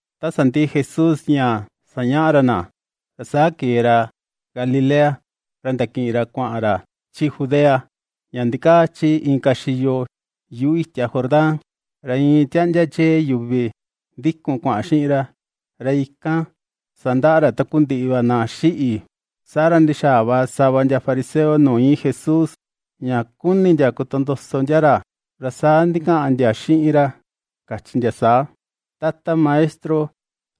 Ta sandiꞌi Jesús ña sañaꞌa ra na, ra saa kee ra Galilea, ra ndakiꞌin ra kuaꞌan ra, chi Judea ña ndikaa chi inka xiyo yuꞌu itia Jordán. Ra iin tiaꞌndia chee yuvi ndikun kuaꞌan xiꞌin ra, ra ikan sandaꞌa ra takundiꞌi va na xiꞌi. Saa ra ndixaa va sava ndia fariseo nuu íin Jesús, ña ^kuni ndia kotondoso ndia ra, ra saa ndikaꞌan ndia xiꞌin ra kachi ndia saa: ―Tata Maestro,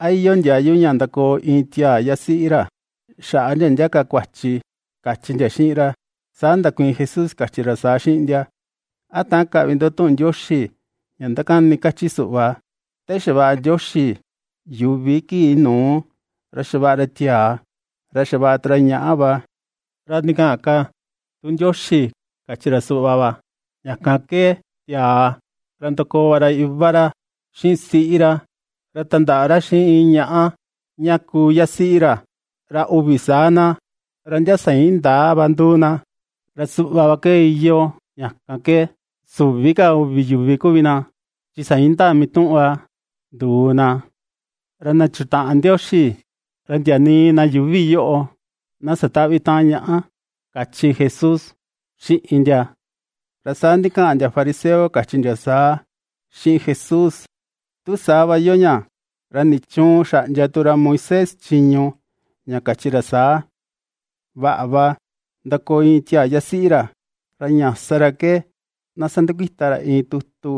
¿a iyoo ndiayu ña ndakoo iin tiaa yasiꞌi ra, xaꞌa ndia ndia ka kuachi? ―kachi ndia xiꞌin ra. Saa ndakuiin Jesús kachi ra saa xiꞌin ndia: ―¿A täan kaꞌvi ndo tuꞌun Ndioxi ña ndakani kachi suꞌva, te xavaꞌa Ndioxi yuvi kii nuu, “ra xavaꞌa ra tiaa, ra xavaꞌa tu ra ñaꞌa va”? Ra ndikaꞌan ka tu Ndioxi kachi ra suꞌva va: “Ña kan ke tiaa, ra ndakoo va ra iva ra xiꞌin siꞌi ra, ra tandaꞌa ra xiꞌin iin ñaꞌa ña kuu yasiꞌi ra, ra uvi saa na, ra ndia sa indaa va nduu na.” Ra suꞌva va ke iyoo, ña kan ke süvi ka uvi yuvi kuvi na, chi sa indaa mituꞌun va nduu na. Ra na chutaꞌan Ndioxi, ra ndia nii na yuuvi yoꞌo na satäꞌvi taꞌan ñaꞌa ―kachi Jesús xiꞌin ndia. Ra saa ndikaꞌan ndia fariseo kachi ndia saa xiꞌin Jesús: ―Tu saa va iyoo ña, ¿ra nichuun xaꞌndia tu ra Moisés chiñu ña kachi ra saa: “Vaꞌa va ndakoo iin tiaa yasiꞌi ra, ra ña sa ra ke na sandakuita ra iin tutu,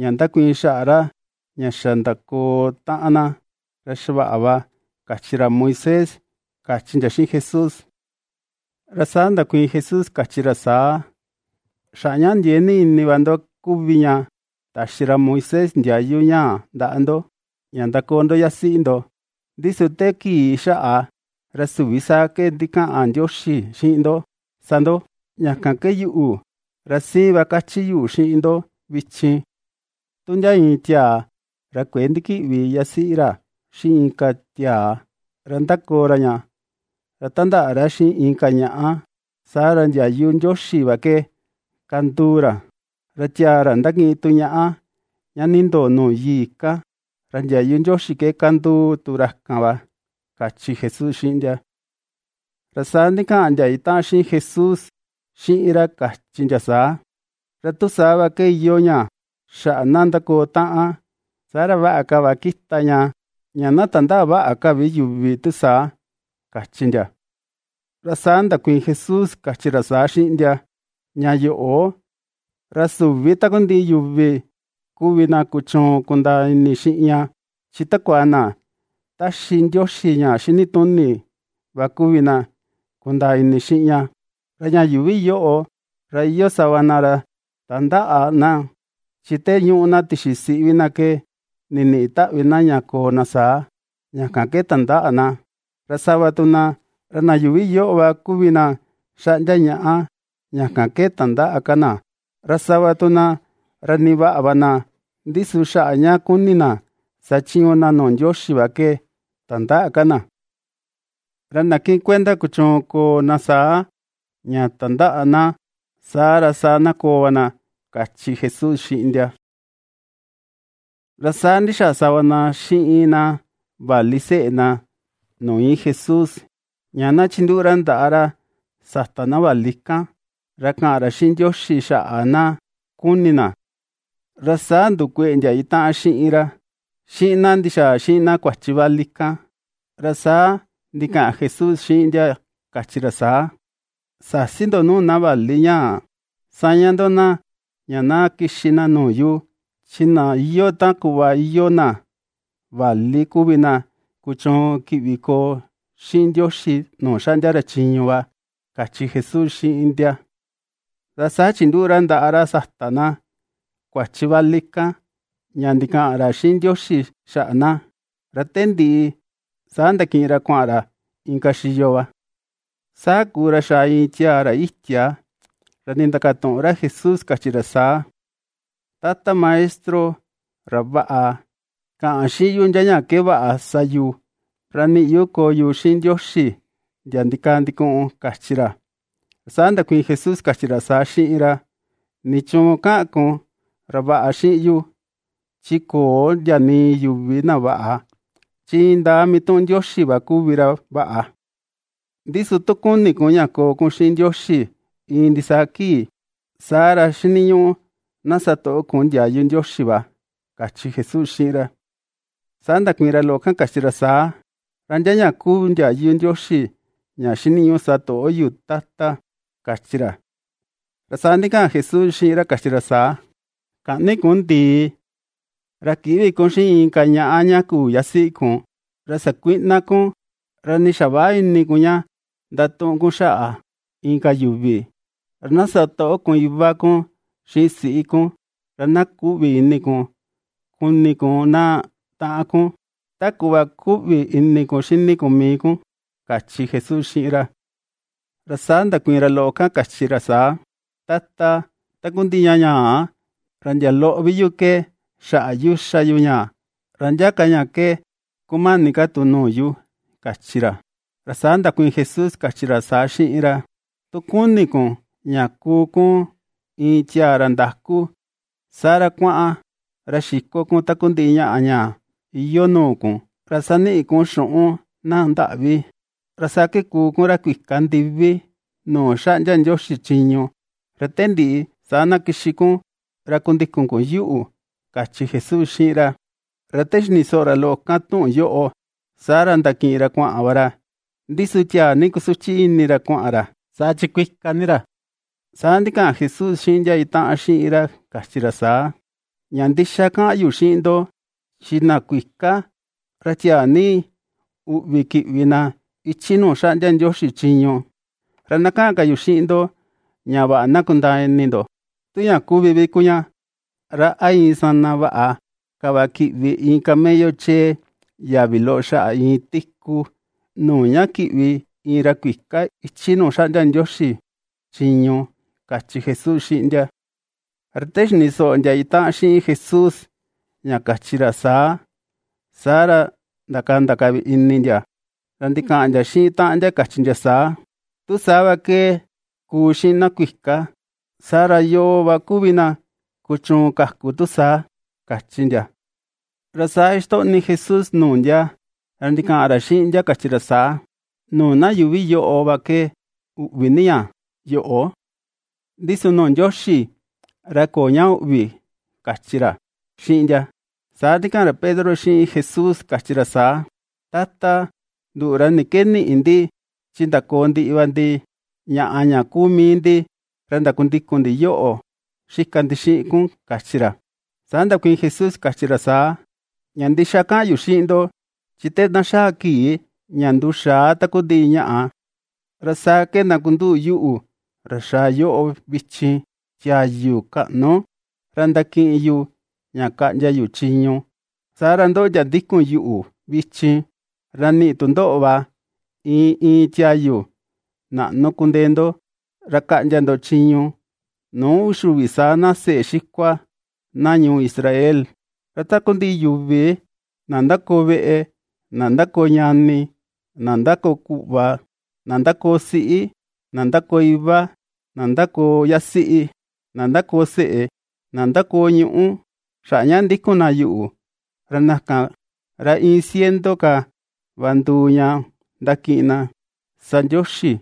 ña ndakuiin xaꞌa ra ña xa ndakoo taꞌan na, saa ra xavaꞌa va”?, kachi ra Moisés ―kachi ndia xiꞌin Jesús. Ra saa ndakuiin Jesús kachi ra saa: ―Xaꞌa ña ndiee ni ini va ndo kuvi ña taxi ra Moisés ndiayu ñaa ndaꞌa ndo, ña ndakoo ndo yasiꞌi ndo, ndi su te kii xaꞌa, ra süvi saa ke ndikaꞌan Ndioxi xiꞌin ndo sa ndo. Ña kan ke yuꞌu, ra siin va kachi yu xiꞌin ndo vichin. Tu ndia iin tiaa ra kuëe ndikiꞌvi yasiꞌi ra xiꞌin inka tiaa, ra ndakoo ra ña, ra tandaꞌa ra xiꞌin inka ñaꞌa, saa ra ndiayu Ndioxi va ke kanduu ra, ra tiaa ra ndakiꞌin tu ñaꞌa ña nindoo nuu yii kan, ra ndiayu Ndioxi ke kanduu tu ra kan va ―kachi Jesús xiꞌin ndia. Ra saa ndikaꞌan ndia itaꞌan xiꞌin Jesús xiꞌin ra kachi ndia saa: ―Ra tu saa va ke iyoo ña xaꞌa na ndakoo taꞌan, saa ra vaꞌa ka va kita ña, ña na tandäꞌa vaꞌa ka vi yuvi tu saa ―kachi ndia. Ra saa ndakuiin Jesús kachi ra saa xiꞌin ndia: ―Ña yoꞌo, ra süvi takundiꞌi yuvi kuvi na kuchuun kundaa ini xiꞌin ña, chi takua na ^taxi Ndioxi ña xinituni va kuvi na kundaa ini xiꞌin ña. Ra ña yuuvi yoꞌo ra iyoo sava na, ra tandäꞌa na chi te ñuꞌu na tixi siꞌi vi na ke niniꞌi taꞌvi na ña koo na saa, ña kan ke tandäꞌa na, ra sava tu na, ra na yuuvi yoꞌo va kuvi na xaꞌndia ñaꞌa, ña kan ke tandäꞌa ka na, ra sava tu na ra nii vaꞌa va na, ndi su xaꞌa ña kuni na sachiñu na nuu Ndioxi va ke tandäꞌa ka na. Ra na kiꞌin kuenda kuchuun koo na saa, ña tandäꞌa na, saa ra saa na koo va na ―kachi Jesús xiꞌin ndia. Ra saa ndixaa sava na xiꞌin na vali seꞌe na nuu íin Jesús, ña na chinduꞌu ra ndaꞌa ra sata na vali kan, ra kaꞌan ra xiꞌin Ndioxi xaꞌa na kuni na. Ra saa ndukueꞌe ndia itaꞌan xiꞌin ra xiꞌin na ndixaa xiꞌin na kuachi vali kan. Ra saa ndikaꞌan Jesús xiꞌin ndia kachi ra saa: ―Säsi ndo nuu na vali ñaa. Saña ndo na, ña na kixi na nuu yu. Chi na iyoo ta kuꞌva iyoo na vali kuvi na kuchuun kiꞌvi koo xiꞌin Ndioxi nuu xaꞌndia ra chiñu va ―kachi Jesús xiꞌin ndia. Ra saa chinduꞌu ra ndaꞌa ra sata na kuachi vali kan ña ndikaꞌan ra xiꞌin Ndioxi xaꞌa na, ra te ndiꞌi saa ndakiꞌin ra kuaꞌan ra inka xiyo va. Saa kuu ra xaa iin tiaa ra itia ra nindakatuꞌun ra Jesús kachi ra saa. ―Tata Maestro, ra vaꞌa, kaꞌan xiꞌin yu ndia ña ke vaꞌa sa yu, ra niꞌi yu koo yu xiꞌin Ndioxi ndia ndikaa ndikuꞌun ―kachi ra. Ra saa ndakuiin Jesús kachi ra saa xiꞌin ra: ―¿Nichuun kaꞌan kun “ra vaꞌa” xiꞌin yu? Chi köo ndia nii yuvi na vaꞌa, chi indaa mituꞌun Ndioxi va kuvi ra vaꞌa. Ndi su tu kuni kun ña koo kun xiꞌin Ndioxi iin ndisaa kii, saa ra xiniñuꞌu na satoꞌo kun ndiayu Ndioxi va ―kachi Jesús xiꞌin ra. Saa ndakuiin ra loꞌo kan kachi ra saa: ―¿Ra ndia ña kuu ndiayu Ndioxi ña xiniñuꞌu satoꞌo yu, Tata? ―kachi ra. Ra saa ndikaꞌan Jesús xiꞌin ra kachi ra saa: ―Käꞌni kun ndii; ra kïꞌvi kun xiꞌin inka ñaꞌa ña küu yasiꞌi kun; ra sakuïꞌna kun; ra nii xaväꞌa ini kun ña ndatuꞌun kun xaꞌa inka yuvi; ra na satoꞌo kun iva kun xiꞌin siꞌi kun; ra na kuꞌvi ini kun kuni kun na taꞌan kun, ta kuꞌva kuꞌvi ini kun xini kun mii kun ―kachi Jesús xiꞌin ra. Ra saa ndakuiin ra loꞌo kan kachi ra saa: ―Tata, takundiꞌi ña ñaa, ra ndia loꞌo vi yu ke xaꞌa yu ^xá yu ña; ¿ra ndia ka ña ke kumani ka tu nuu yu? ―kachi ra. Ra saa ndakuiin Jesús kachi ra saa xiꞌin ra: ―Tu kuni kun ña kuu kun iin tiaa ra ndaku, saa ra kuaꞌan ra xiko kun takundiꞌi ñaꞌa ña iyoo nuu kun, ra saniꞌi kun xuꞌun na ndaꞌvi, ra saa ke kuu kun ra kuika ndivi nuu xaꞌndia Ndioxi chiñu, ra te ndiꞌi saa na kixi kun ra kundikun kun yuꞌu ―kachi Jesús xiꞌin ra. Ra te xini soꞌo ra loꞌo kan tuꞌun yoꞌo, saa ra ndakiꞌin ra kuaꞌan va ra, ndi su tiaa ni kusuchi ini ra kuaꞌan ra, saa chi kuika ni ra. Saa ndikaꞌan Jesús xiꞌin ndia itaꞌan xiꞌin ra kachi ra saa: ―Ña ndixa kaꞌan yu xiꞌin ndo, chi na kuika, ra tiaa ni uꞌvi kiꞌvi na ichi nuu xaꞌndia Ndioxi chiñu. Ra na kaꞌan ka yu xiꞌin ndo ña vaꞌa na kundaa ini ndo: Tu ña kuvi vi kuu ña, ra a iin sana vaꞌa ka va kiꞌvi iin camello chee yavi loꞌo xaꞌa iin tiku, nuu ña kiꞌvi iin ra kuika ichi nuu xaꞌndia Ndioxi chiñu ―kachi Jesús xiꞌin ndia. Ra te xini soꞌo ndia itaꞌan xiꞌin Jesús ña kachi ra saa, saa ra ndakanda ka vi ini ndia, ra ndikaꞌan ndia xiꞌin taꞌan ndia kachi ndia saa: ―Tu saa va ke kuu xiꞌin na kuika, saa ra, ¿yoo va kuvi na kuchuun kaku tu saa? ―kachi ndia. Ra saa ^ixtoꞌni Jesús nuu ndia, ra ndikaꞌan ra xiꞌin ndia kachi ra saa: ―Nuu na yuuvi yoꞌo va ke uꞌvi ni ña yoꞌo, ndi su nuu Ndioxi, ra köo ña üꞌvi ―kachi ra xiꞌin ndia. Saa ndikaꞌan ra Pedro xiꞌin Jesús kachi ra saa: ―Tata, nduꞌu, ra ni ke niꞌi ndi, chi ndakoo ndiꞌi va ndi ñaꞌa ña kuu mii ndi, ra ndakundikun ndi yoꞌo xika ndi xiꞌin kun ―kachi ra. Saa ndakuiin Jesús kachi ra saa. ―Ña ndixa kaꞌan yu xiꞌin ndo, chi te na xaa kii ña nduxaa takundiꞌi ñaꞌa, ra saa ke ndakunduꞌu yuꞌu, ra xaa yoꞌo vichin, tiayu kaꞌnu, ra ndakiꞌin yu ña kaꞌndia yu chiñu. Saa ra ndoꞌo ndia ndikun yuꞌu vichin, ra niꞌi tu ndoꞌo va iin iin tiayu naꞌnu kundee ndo, ra kaꞌndia ndo chiñu nuu uxi uvi saa na seꞌe xikua na ñuu Israel. Ra takundiꞌi yuvi, na ndakoo veꞌe, na ndakoo ñani, na ndakoo kuꞌva, na ndakoo siꞌi, na ndakoo iva, na ndakoo yasiꞌi, na ndakoo seꞌe, na ndakoo ñuꞌú, xaꞌa ña ndikun na yuꞌu, ra na kan, ra iin ciento ka va nduu ña ndakiꞌin na sa Ndioxi,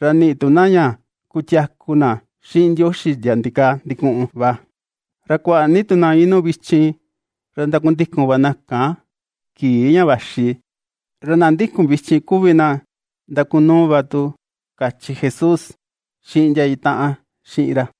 ra niꞌi tu na ña kutiaku na xiꞌin Ndioxi ndia ndikaa ndikuꞌun va. Ra kuaꞌa ni tu na inuu vichin, ra ndakundikun va na kan kii ña vaxi, ra na ndikun vichin kuvi na ndakunuu va tu ―kachi Jesús xiꞌin ndia itaꞌan xiꞌin ra.